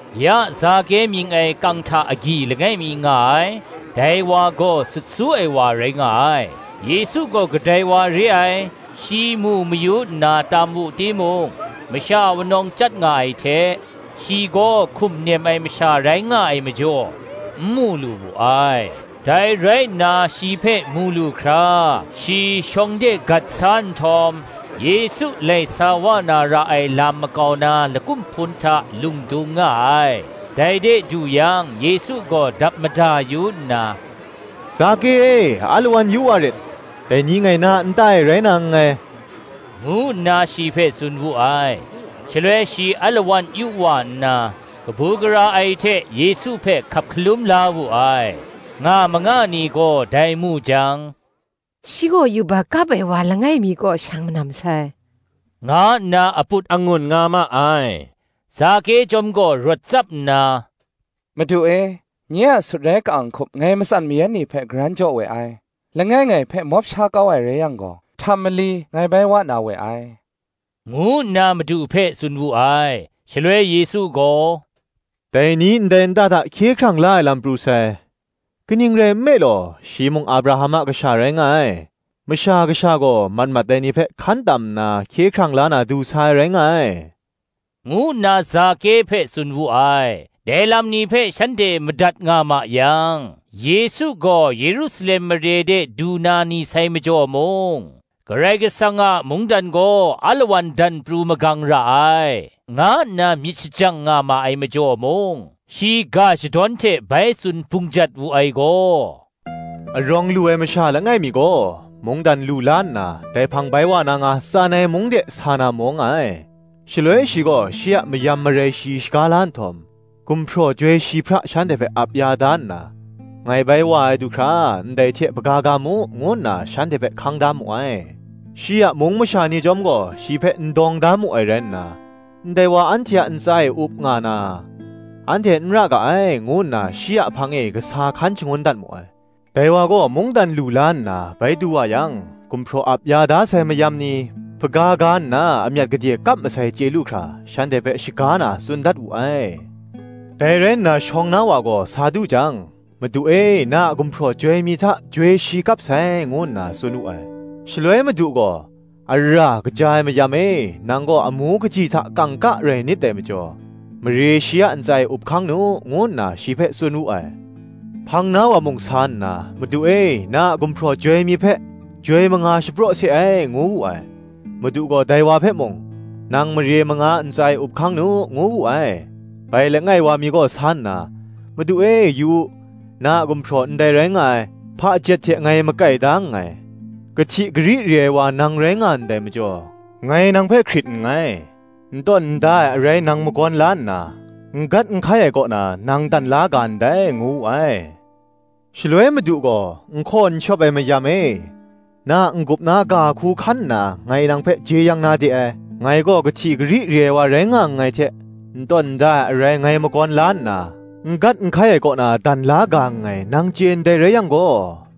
Ya Zake mying ai kang hta agyi langai mi nga ai; dai wa gaw sut su ai wa rai nga ai; Yesu gaw kadai wa re ai, shi mu mayu nna tam wu timung, masha wunawng chyat nga ai hte, shi gaw hkum nem ai masha rai nga ai majaw, n mu lu wu ai. Dai rai nna shi hpe mu lu hkra, shi shawng de gat sa nhtawm, Yesu lai sa wa na ra ai lam makau na lakum hpun hta lung dung nga ai. Dai de du yang Yesu gaw dap mada yu nna, “Zake e, alawan yu wa rit; dai ni ngai na a nta e rai na nngai,” ngu nna shi hpe tsun wu ai. Shaloi shi alawan yu wa nna, kabu gara ai hte Yesu hpe hkap hkalum la wu ai. Nga manga ni gaw dai mu jang, shi gaw yubak kap ai wa langai mi kaw shang manam sai, nga nna aput angun nga ma ai. Zake chyawm gaw rawt tsap nna, “Madu e, nye a sutrai ka-ang hkup ngai matsan mayan ni hpe karan jaw we ai: langai ngai hpe mawp sha kau ai rai yang gaw, htam mali ngai bai wa na we ai,” ngu nna Madu hpe tsun wu ai. Shaloi Yesu gaw, “Dai ni ndai nta hta hkye hkrang la ai lam pru sai: kaning rai nme law, shi mung Abraham a kasha rai nga ai. Masha Kasha gaw mat mat ai ni hpe, hkan tam nna hkye hkrang la na du sa ai rai nga ai,” ngu nna Zake hpe tsun wu ai. Dai lam ni hpe shanhte madat nga ma yang, Yesu gaw Yerusalem mare de du na ni sai majaw mung, Karai Kasang a mungdan gaw alawan dan pru magang ra ai, nga nna myit shajang nga ma ai majaw mung, shi ga shadawn hte bai tsun bungjat wu ai gaw, “Arawng lu ai masha langai mi gaw, mungdan lu la nna dai hpang bai wa na nga, tsan ai mung de sa na maw nga ai. Shaloi shi gaw shi a mayam marai shi shaga la nhtawm, gumhpraw joi shi hpra shanhte hpe ap ya da nna, ngai bai wa ai du hkra ndai hte hpaga ga mu, ngu nna shanhte hpe hkang da mu ai. Shi a mung masha ni chyawm gaw, shi hpe n dawng da mu ai rai nna, ‘Ndai wa anhte a ntsa e up nga na, anhte n ra ga ai,’ ngu nna shi a hpang e kasa hkan shangun dat mu ai. Dai wa gaw mungdan lu la nna bai du wa yang, gumhpraw ap ya da sai mayam ni, hpaga ga nna amyat gade kap masai chye lu hkra, shanhte hpe shaga na, tsun dat wu ai. Dai rai nna shawng na wa gaw sa du jang, “Madu e, na a gumhpraw joi mi hta, joi shi kap sai,” ngu nna tsun wu ai. Shaloi Madu gaw, “Ara, kaja ai mayam e, nang gaw amu kaji hta kangka rai nit dai majaw, mare shi a ntsa e up hkang nu,” ngu nna shi hpe tsun wu ai. Hpang na wa mung sa nna, “Madu e, na a gumhpraw joi mi hpe, joi manga shapraw se ai,” ngu wu ai. Madu gaw dai wa hpe mung, “Nang mare manga a ntsa e up hkang nu,” ngu wu ai. Bai langai wa mi gaw sa nna, “Madu e, yu u, na a gumhpraw ndai rai nga ai, hpajet hte ngai makai da nngai: kahti kari re ai wa nang rai nga ndai majaw, ngai nang hpe hkrit nngai: n tawn n da ai arai nang magawn la nna, n gat n hkai ai kaw na, nang dan la ga ndai,” ngu wu ai. Shaloi madu gaw, N hkaw n shawp ai mayam e, na a n-gup na ga hku hkan nna ngai nang hpe jeyang na de ai: ngai gaw kahti kari re ai wa rai nga nngai hte, n tawn n da ai arai ngai magawn la nna, n gat n hkai ai kaw na dan la ga nngai, nang chye ndai rai yang gaw,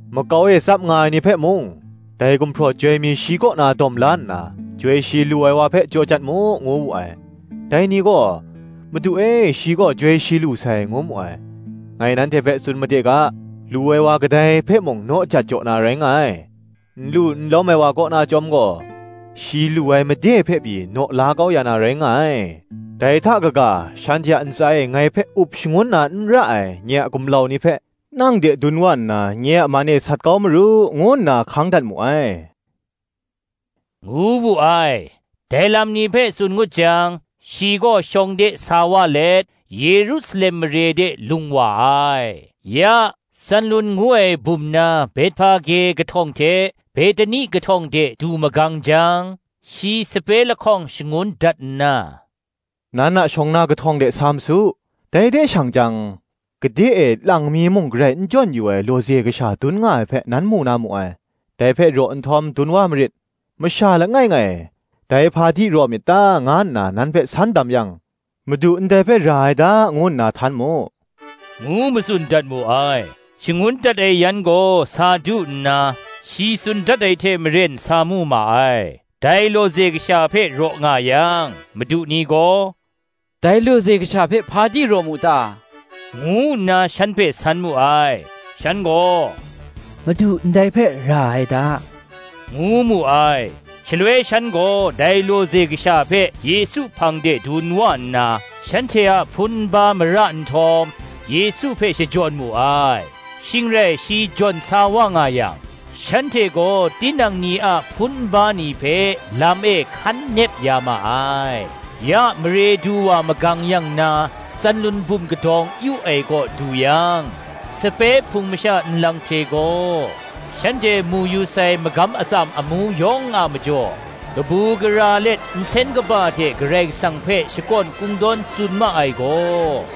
Makau e tsap nga ai ni hpe mung, “Dai gumhpraw joi mi shi kaw na dawm la nna, joi shi lu ai wa hpe jaw jat mu,” ngu wu ai. Dai ni gaw, “Madu e, shi gaw joi shi lu sai,” ngu mu ai. “Ngai nanhte hpe tsun made ga. Lu ai wa kadai hpe mung, naw jat jaw na rai nga ai; n lu n lawm ai wa kaw na chyawm gaw, shi lu ai made hpe pyi naw la kau ya na rai nga ai. Dai hta kaga, shanhte a ntsa e ngai hpe up shangun na n ra ai, nye a gumlau ni hpe, nang de dun wa nna, nye a man e sat kau maru, ngu nna hkang dat mu ai,” ngu wu ai. Dai lam ni hpe tsun ngut jang, shi gaw shawng de sa wa let, Yerusalem mare de lung wa ai. Ya, Tsanlun ngu ai bum na Bethpage kahtawng hte Behtani kahtawng de du magang jang, shi sape lahkawng shangun dat nna, “Nan a shawng na kahtawng de sa ma su; dai de shang jang, gade e lang mi muk garai n jawn yu ai lawze kasha dun nga ai hpe, nan mu na mu ai: dai hpe raw nhtawm dun wa marit: masha langai ngai, ‘Dai hpa di raw myit ta?’ nga nna nan hpe san dam yang, ‘Madu ndai hpe ra ai da,’ ngu nna htan mu,” ngu matsun dat mu ai. Shangun dat ai yan gaw sa du nna, shi tsun dat ai hte maren sa mu ma ai. Dai lawze kasha hpe raw nga yang, madu ni gaw, “Dai lawze kasha hpe hpa di raw mu ta?” ngu nna shan hpe san mu ai. Shan gaw, “Madu ndai hpe ra ai da,” ngu mu ai. Shaloi shan gaw dai lawze kasha hpe Yesu hpang de dun wa nna, shanhte a hpun nba mara nhtawm, Yesu hpe shajawn mu ai. Shing rai shi jawn sa wa nga yang, shanhte gaw tinang ni a hpun nba ni hpe lam e hkan nep ya ma ai. Ya mare du wa magang yang na Tsanlun bum kadawng yu ai kaw du yang, sape hpung masha nlang hte gaw, shanhte mu yu sai magam atsam amu yawng a majaw, kabu gara let nsen kaba hte Karai Kasang hpe shakawn kungdawn tsun ma ai gaw,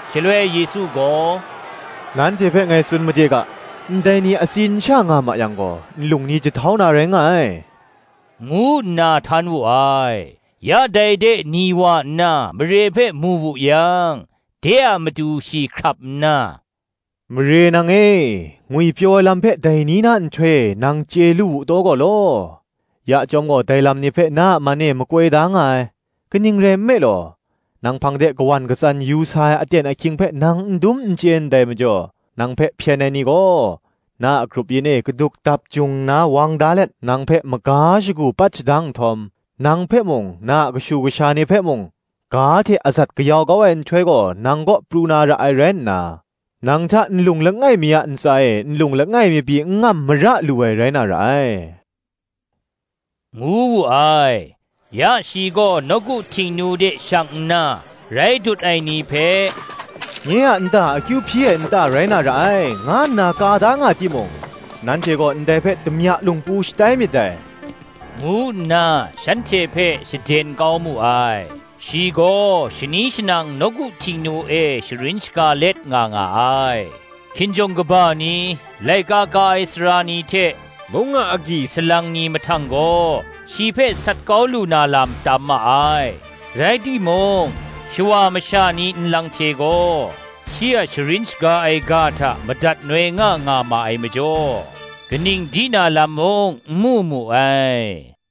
Shaloi Yesu gaw, Nanhte hpe ngai tsun made ga, “Ndai ni atsin sha nga ma yang gaw, nlung ni jahtau na rai nga ai,” ngu nna htan wu ai. Ya dai de ni wa nna mare hpe mu wu yang, de a matu shi hkrap nna, “Mare nang e, ngwipyaw ai lam hpe dai ni na nhtoi e nang chye lu wu taw gaw law! ya chyawm gaw dai lam ni hpe na a man e makoi da nga ai. Kaning rai nme law, nang hpang de kawan katsan yu sa ai aten ahkying hpe nang n dum n chye ndai majaw, nang hpe hpyen ai ni gaw na a grup yin e gaduk dap jung nna wang da let, nang hpe maga shagu pat shadang nhtawm, nang hpe mung, na a kashu kasha ni hpe mung, ga hte azat kayau kau ai nhtoi gaw, nang kaw pru na ra ai rai nna, nang hta nlung langai mi a ntsa e nlung langai mi pyi n ngam mara lu ai rai na ra ai,” ngu wu ai. Ya shi gaw nawku Htingnu de shang nna, rai dut ai ni hpe, “Nye a nta akyu hpyi ai nta rai na ra ai, nga nna ka da nga timung, nanhte gaw ndai hpe damya lungpu shatai myit dai, ngu nna shanhte hpe shaden kau mu ai. Shi gaw shani shanang nawku Htingnu e sharin shaga let nga nga ai. Hkinjawng kaba ni, laika ka ai sara ni hte, mung a agyi salang ni mahtang gaw, shi hpe sat kau lu na lam tam ma ai: rai timung, shawa masha ni nlang hte gaw, shi a sharin shaga ai ga hta madat noi nga nga ma ai majaw, kaning di na lam mung, n mu mu ai.